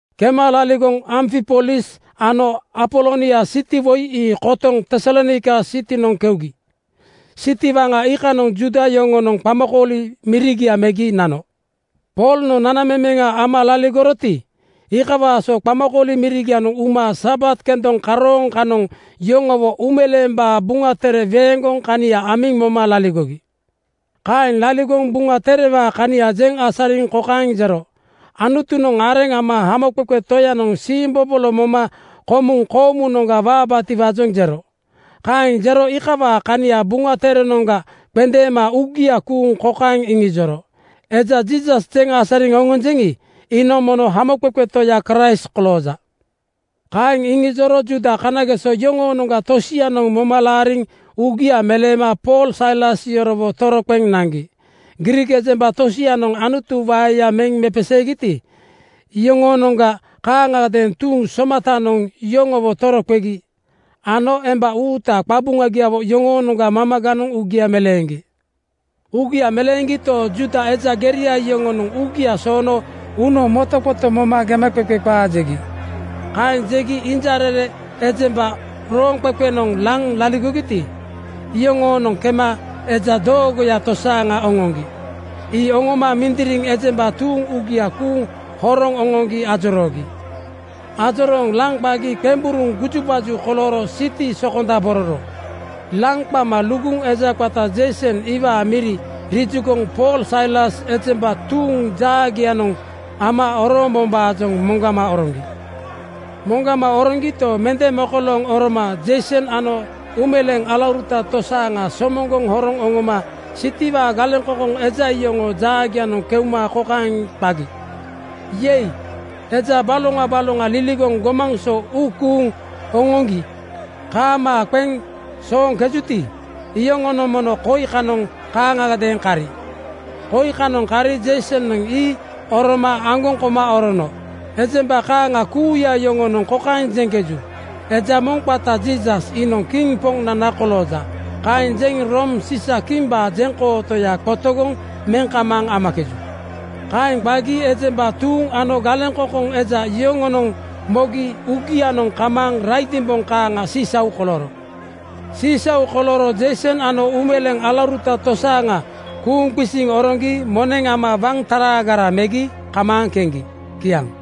Kema laligoŋ Amfipolis ano Apolonia siti woi ii kotoŋ Tesalonaika sitinoŋ keugi. Siti waŋa iikanoŋ Juuda yoŋonoŋ qamakooli mirigia megi nano. Poolnoŋ nanamemeŋa ama laligoroti, iikawaa so qamakooli mirigianoŋ uma Sabat kendoŋ karooŋ kanoŋ yoŋowo Uumeleembaa Buŋa Tere weeŋgoŋ kania amiŋ moma laligogi. Kaeŋ laligoŋ Buŋa Terewaa kania jeŋ asariŋ kokaeŋ jero, “Anutunoŋ areŋ ama Hamoqeqe Toyanoŋ siimbobolo moma komuŋ koomunoŋga waabaatiwaajoŋ jero.” Kaeŋ jeŋ iikawaa kania Buŋa Terenoŋga qendeema uugia kuuŋ kokaeŋ iŋijoro, “Eja Jiisas jeŋ asariŋ oŋonjeŋi, iinoŋ mono Hamoqeqe Toya Kraist kolooja.” Kaeŋ iŋijoro Juuda kanageso yoŋoonoŋga tosianoŋ moma laariŋ uugia meleema Pool Sailas yorowo toroqeŋ naŋgi. Griik ejemba tosianoŋ Anutu waeya meŋ mepeseegiti, iyoŋoonoŋga kaaŋagadeeŋ tuuŋ somatanoŋ yoŋowo toroqegi ano emba uuta qabuŋagiawo yoŋoonoŋga mamaganoŋ uugia meleeŋgi. Uugia meleeŋgito, Juuda eja geria yoŋonoŋ uugia soono uunoŋ motoqoto moma gemaqeqe qaa jegi. Kaeŋ jegi injarere ejemba rooŋqeqenoŋ laŋ laligogiti, iyoŋoonoŋ kema eja doogoya tosaaŋa oŋoŋgi. Ii oŋoma mindiriŋ ejemba tuuŋ uugia kuuŋ horoŋ oŋoŋgi ajoroogi. Ajorooŋ laŋ qagi qemburuŋ gujubaju kolooro siti sokonda-bororo. Laŋ qama luguŋ eja qata Jeison iwaa miri rijugoŋ Pool Sailas ejemba tuuŋ jaagianoŋ ama orombombaajoŋ moŋgama oroŋgi. Moŋgama oroŋgito, mende mokolooŋ oroma Jeison ano uumeleeŋ alauruta tosaaŋa somoŋgoŋ horoŋ oŋoma sitiwaa galeŋkoŋkoŋ eja yoŋoo jaagianoŋ keuma kokaeŋ qagi, “Yei! Eja baloŋa baloŋa liligoŋ gomaŋ so uu kuuŋ oŋoŋgi kaamaa qeŋ sooŋkejuti, iyoŋonoŋ mono koi kanoŋ kaaŋagadeeŋ kari. Koi kanoŋ kari Jeisonoŋ ii oroma aŋgoŋ koma orono. Ejemba kaaŋa kuuya yoŋonoŋ kokaeŋ jeŋkeju, ‘Eja moŋ qata Jiisas iinoŋ kiŋ Poŋnana kolooja.’ Kaeŋ jeŋ Room Siisa-kimbaa jeŋkootoya qotogoŋ meŋ kamaaŋ amakeju.” Kaeŋ qagi ejemba tuuŋ ano galeŋkoŋkoŋ eja yoŋonoŋ mogi uugianoŋ kamaaŋ raidimboŋ kaaŋa sisau kolooro. Sisau kolooro Jeison ano uumeleeŋ alauruta tosaaŋa kuuŋ qisiŋ oŋoŋgi moneŋ ama waŋ taraagara megi kamaaŋ keŋgi. Kiaŋ.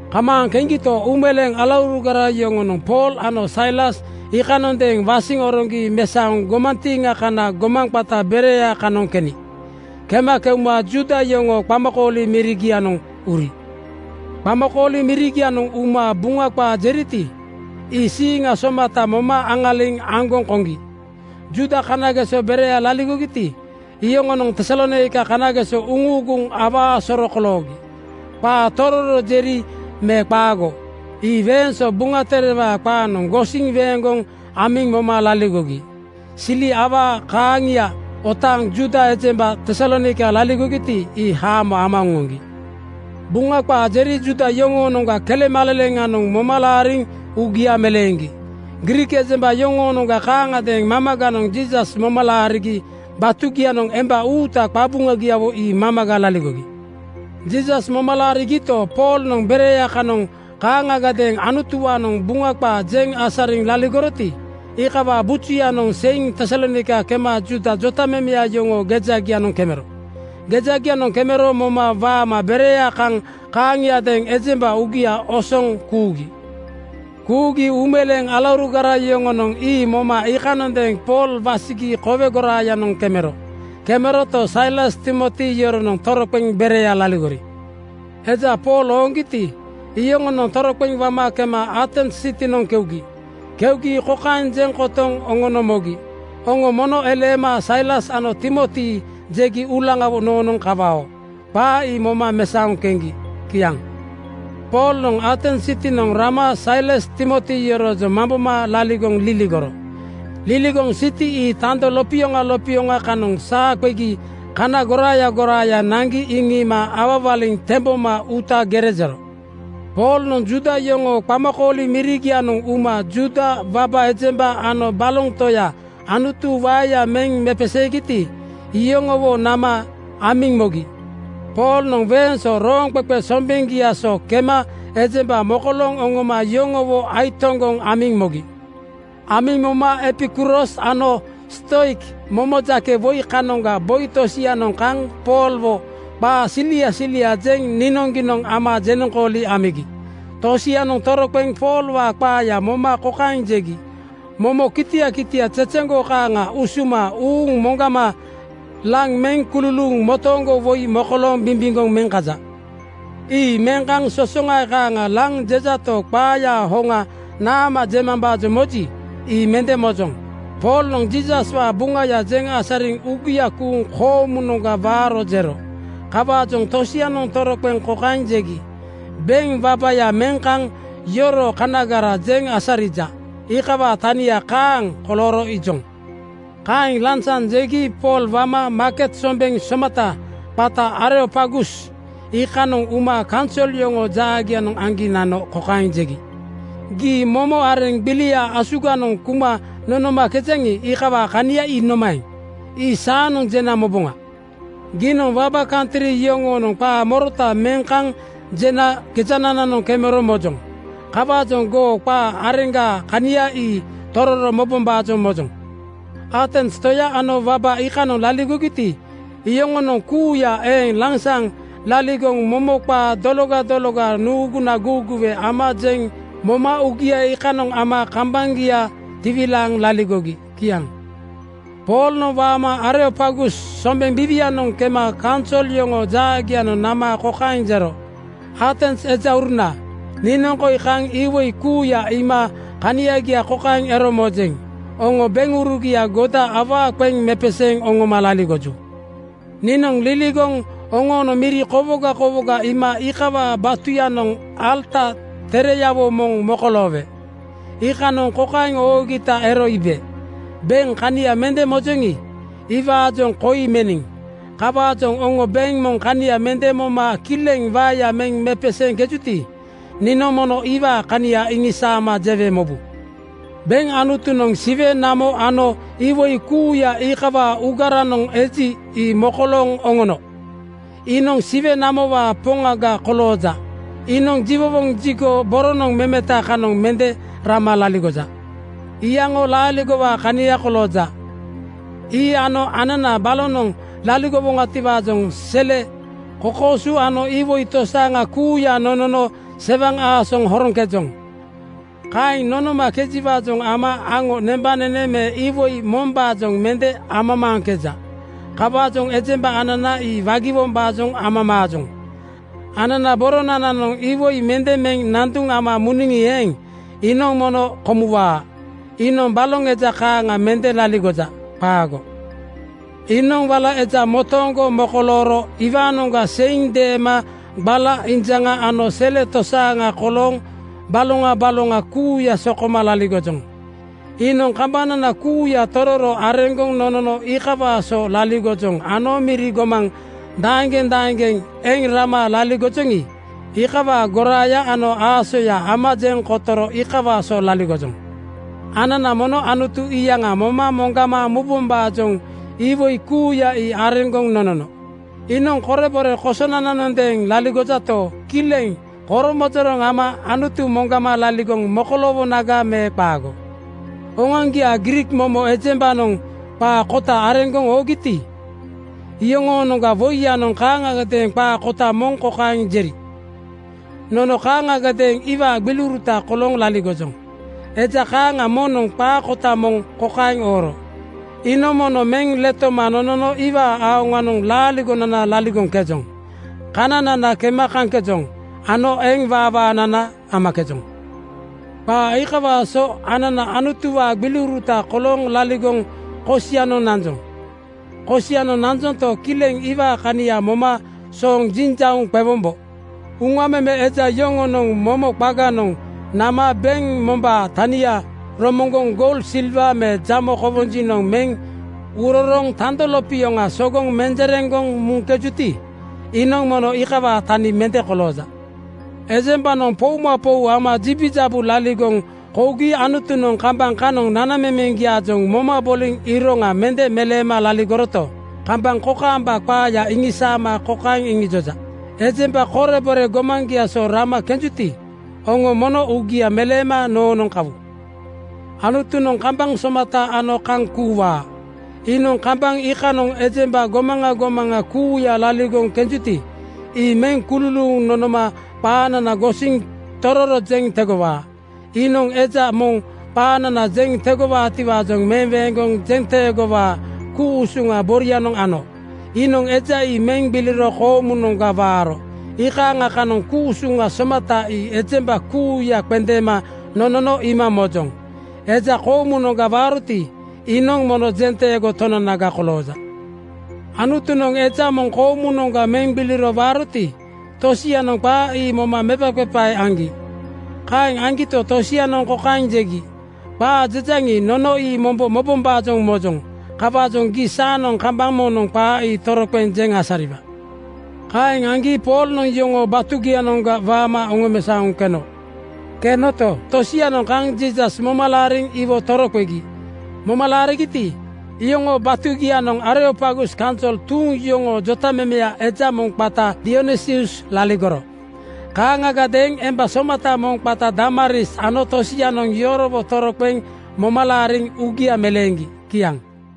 Kamaaŋ keŋgito, uumeleeŋ alaurugara yoŋonoŋ Pool ano Sailas iikanondeeŋ wasiŋ oroŋgi mesaoŋ gomantiiŋa kana gomaŋ qata Berea kanoŋ keni. Kema keuma Juuda yoŋoo qamakooli mirigianoŋ uri. Qamakooli mirigianoŋ uma Buŋa qaa jeriti, ii siiŋa somata moma aŋaliŋ aŋgoŋ koŋgi. Juuda kanageso Berea laligogiti, iyoŋonoŋ Tesalonaika kanageso uŋuuguŋ awaa soro koloogi. Qaa tororo jeri me qaago, ii weeŋ so Buŋa Terewaa qaanoŋ gosiŋ weeŋgoŋ amiŋ moma laligogi. Sili awaa kaaŋia otaaŋ Juuda ejemba Tesalonaika laligogiti, ii haamo ama oŋoŋgi. Buŋa qaa jeri Juuda yoŋoonoŋga kelemaleleŋanoŋ moma laariŋ uugia meleeŋgi. Griik ejemba yoŋoonoŋga kaaŋagadeeŋ mamaganoŋ Jiisas moma laarigi batugianoŋ emba uuta qabuŋagiawo ii mamaga laligogi. Jiisas moma laarigito, Poolnoŋ Berea kanoŋ kaaŋagadeeŋ Anutuwaanoŋ Buŋa qaa jeŋ asariŋ laligoroti, iikawaa bujuyanoŋ seiŋ Tesalonaika kema Juuda jotamemeya yoŋoo gejagianoŋ kemero. Gejagianoŋ kemero moma waama Berea kaŋ kaaŋiadeeŋ ejemba uugia osoŋ kuugi. Kuugi uumeleeŋ alaurugara yoŋonoŋ ii moma iikanondeeŋ Pool wasigi kowe goraayanoŋ kemero. Kemeroto, Sailas Timoti yoronoŋ toroqeŋ Berea laligori. Eja Pool ooŋgiti, iyoŋonoŋ toroqeŋ wama kema Atens sitinoŋ keugi. Keugi kokaeŋ jeŋ kotoŋ oŋono mogi, “Oŋo mono eleema Sailas ano Timoti jegi uulaŋawo noonoŋ kawao.” Qaa ii moma mesaoŋ keŋgi. Kiaŋ. Poolnoŋ Atens sitinoŋ rama Sailas Timoti yoroojoŋ mamboma laligoŋ liligoro. Liligoŋ siti ii tando lopioŋa lopioŋa kanoŋ saa qegi kana goraaya goraaya naŋgi iŋiima awawaliŋ temboma uuta gere jero. Poolnoŋ Juuda yoŋoo qamakooli mirigianoŋ uma Juuda waba ejemba ano baloŋ toya Anutu waeya meŋ mepeseegiti, iyoŋowo nama amiŋ mogi. Poolnoŋ weeŋ so rooŋqeqe sombeŋgia so kema ejemba mokolooŋ oŋoma yoŋowo aitoŋgoŋ amiŋ mogi. Amiŋ mogi Epikuros ano Stoik momo jake woi kanoŋa boi tosianoŋ kaŋ Poolwo qaa silia siliaa jeŋ niinoŋgiinoŋ ama jenoŋkooli amigi. Tosianoŋ toroqeŋ Poolwaa qaaya moma kokaeŋ jegi, “Momo kitia kitia zezeŋgo kaaŋa usuma uuŋ moŋgama laŋ meŋ kululuuŋ motooŋgo woi mokolooŋ bimbimgoŋ meŋ kaja. Ii meŋ kaŋ sosoŋae kaaŋa laŋ jejato, qaayaa hoŋa naama jemambaajoŋ moji, ii mende mojoŋ.” Poolnoŋ Jiisaswaa Buŋaya jeŋ asariŋ uugia kuuŋ koomunoŋga waaro jero. Kawaajoŋ tosianoŋ toroqeŋ kokaeŋ jegi, “Beŋ wabaya meŋ kaŋ yoroo kanagara jeŋ asarija, iikawaa tania kaaŋ kolooro iijoŋ.” Kaeŋ lansaŋ jegi Pool wama maaket sombeŋ somata qata Areopagus iikanoŋ uma kaunsol yoŋoo jaagianoŋ aŋgi nano kokaeŋ jegi, “Gii momo areŋ gbilia asuganoŋ kuma nonomakejaŋi, iikawaa kania ii nomaeŋ? Ii saanoŋ jena moboŋa. Giinoŋ waba kantri yoŋoonoŋ qaa morota meŋ kaŋ jena gejanananoŋ kemero mojoŋ. Kawaajoŋ goo qaa areŋgaa kania ii tororo mobombaajoŋ mojoŋ.” Atens toya ano waba iikanoŋ laligogiti, iyoŋonoŋ kuuya eeŋ lansaŋ laligoŋ momo qaa dologa dologa nuuguna guuguwe ama jeŋ moma uugia iikanoŋ ama kambaŋgia tiwilaaŋ laligogi. Kiaŋ. Poolnoŋ waama Areopagus sombeŋ biiwianoŋ kema kaunsol yoŋoo jaagianoŋ nama kokaeŋ jero, “Atens ejauruna, niinoŋ koi kaŋ iwoi kuuya iima kaniagia kokaeŋ ero mojeŋ: Oŋo beŋurugia goda awaa qeŋ mepeseeŋ oŋoma laligoju. Niinoŋ liligoŋ oŋoonoŋ miri kowoga kowoga iima iikawaa batuyanoŋ alata tereyawo moŋ mokoloowe. Iikanoŋ kokaeŋ oogita ero iibe, ‘Beŋ kania mende mojoŋi, iwaajoŋ koi meniŋ.’ Kawaajoŋ oŋo beŋ moŋ kania mende moma kileŋ waeya meŋ mepeseeŋkejuti, niinoŋ mono iwaa kania iŋisaama jewe mobu. “Beŋ Anutunoŋ Siwe namo ano iwoi kuuya iikawaa uugaranoŋ eji, ii mokolooŋ oŋono. Iinoŋ Siwe namowaa Poŋaga kolooja. Iinoŋ jiwowoŋ jigo boronoŋ memeta kanoŋ mende rama laligoja. Iyaŋo laaligowaa kania kolooja. Ii ano anana balonoŋ laligowoŋatiwaajoŋ sele, kokooso ano iwoi tosaaŋa kuuya nonono sewaŋ aasoŋ horoŋkejoŋ. Kaeŋ nonomakejiwaajoŋ ama aŋo nembanene me iwoi mombaajoŋ mende amamaaŋkeja. Kawaajoŋ ejemba anana ii wagiwombaajoŋ amamaajoŋ. Anana boronananoŋ iwoi mende meŋ nanduŋ ama muniŋi eeŋ, iinoŋ mende komuwaa. Iinoŋ baloŋ eja kaaŋa mende laligoja. Qaago. “Iinoŋ wala eja motooŋgo mokolooro iwaanoŋga seiŋ deema gbala injaŋa ano sele tosaaŋa kolooŋ baloŋa baloŋa kuuya sokoma laligojoŋ. Iinoŋ kambanana kuuya tororo areŋgoŋ nonono iikawaa so laligojoŋ ano miri gomaŋ daeŋgeŋ daeŋgeŋ eŋ rama laligojoŋi, iikawaa goraaya ano aasoya ama jeŋ kotoro iikawaa so laligojoŋ. Anana mono Anutu iyaŋa moma moŋgama mubombaajoŋ iwoi kuuya ii areŋgoŋ nonono. Iinoŋ korebore kosonananondeeŋ laligojato, kileŋ koromojoroŋ ama Anutu moŋgama laligoŋ mokoloowonaga me qaago? Oŋoaŋgiaa Griik momo ejembanoŋ qaa kota areŋgoŋ oogiti, iyoŋoonoŋga woiyanoŋ kaaŋagadeeŋ qaa kota moŋ kokaeŋ jeri, ‘Nono kaaŋagadeeŋ iwaa gbiliuruta kolooŋ laligojoŋ.’ Eja kaaŋa moŋnoŋ qaa kota moŋ kokaeŋ ooro, ‘Iinoŋ mono meŋ letoma nonono iwaa aoŋanoŋ laaligonana laligoŋkejoŋ, kananana kema kaŋkejoŋ ano eŋ waawaanana amakejoŋ.’ Qaa iikawaa so anana Anutuwaa gbiliuruta kolooŋ laligoŋ kosianoŋ nanjoŋ. Kosianoŋ nanjonto, kileŋ iwaa kania moma sooŋ jinjauŋ qewombo. Uŋa meme eja (artist) yoŋonoŋ momo qaganoŋ nama beŋ mombaa tania romoŋgoŋ goul, silwa me jamo kowonjiŋ meŋ urorooŋ tando lopioŋa sogoŋ menjereŋgoŋ meŋkejuti, iinoŋ mono iikawaa tani mende kolooja. Ejembanoŋ poumapou ama jibijabu laligoŋ kougi Anutunoŋ kambaŋ kanoŋ nanamemeŋgiaajoŋ moma boliŋ iroŋa mende meleema laligoroto, kambaŋ kokaamba qaaya iŋisaama kokaeŋ iŋijoja, ‘Ejemba korebore gomaŋgia so rama kenjuti, oŋo mono uugia meleema noonoŋ kawu.’ “Anutunoŋ kambaŋ somata ano kaŋ kuuwaa. Iinoŋ kambaŋ iikanoŋ ejemba gomaŋa gomaŋa kuuya laligoŋ kenjuti, ii meŋ kululuuŋ nonoma qaanana gosiŋ tororo jeŋ tegowaa. Iinoŋ eja moŋ qaanana jeŋ tegowaatiwaajoŋ meweeŋgoŋ jenteegowaa ku-usuŋa borianoŋ ano. Iinoŋ eja ii meŋ gbiliro koomunoŋga waaro iikaaŋa kanoŋ ku-usuŋa somata ii ejemba kuuya qendeema nonono iima mojoŋ. Eja koomunoŋga waaroti, iinoŋ mono jenteego Tonanaga kolooja.” ‘Anutunoŋ eja moŋ koomunoŋga meŋ gbiliro waaroti,’ tosianoŋ qaa ii moma mepaqepae aŋgi. Kaeŋ aŋgito, tosianoŋ kokaeŋ jegi, “Qaa jejaŋi, nono ii mombo mobombaajoŋ mojoŋ. Kawaajoŋ gii saanoŋ kambaŋ moŋnoŋ qaa ii toroqeŋ jeŋ asariwa.” Kaeŋ aŋgi Poolnoŋ yoŋoo batugianoŋga waama oŋomesaoŋ keno. Kenoto, tosianoŋ kaŋ Jiisas moma laariŋ iwo toroqegi. Moma laarigiti, iyoŋoo batugianoŋ Areopagus kaunsol tuuŋ yoŋoo jotamemeya eja moŋ qata Dionisius laligoro. Kaaŋagadeeŋ emba somata moŋ qata Damaris ano tosianoŋ yorowo toroqeŋ moma laariŋ uugia meleeŋgi. Kiaŋ.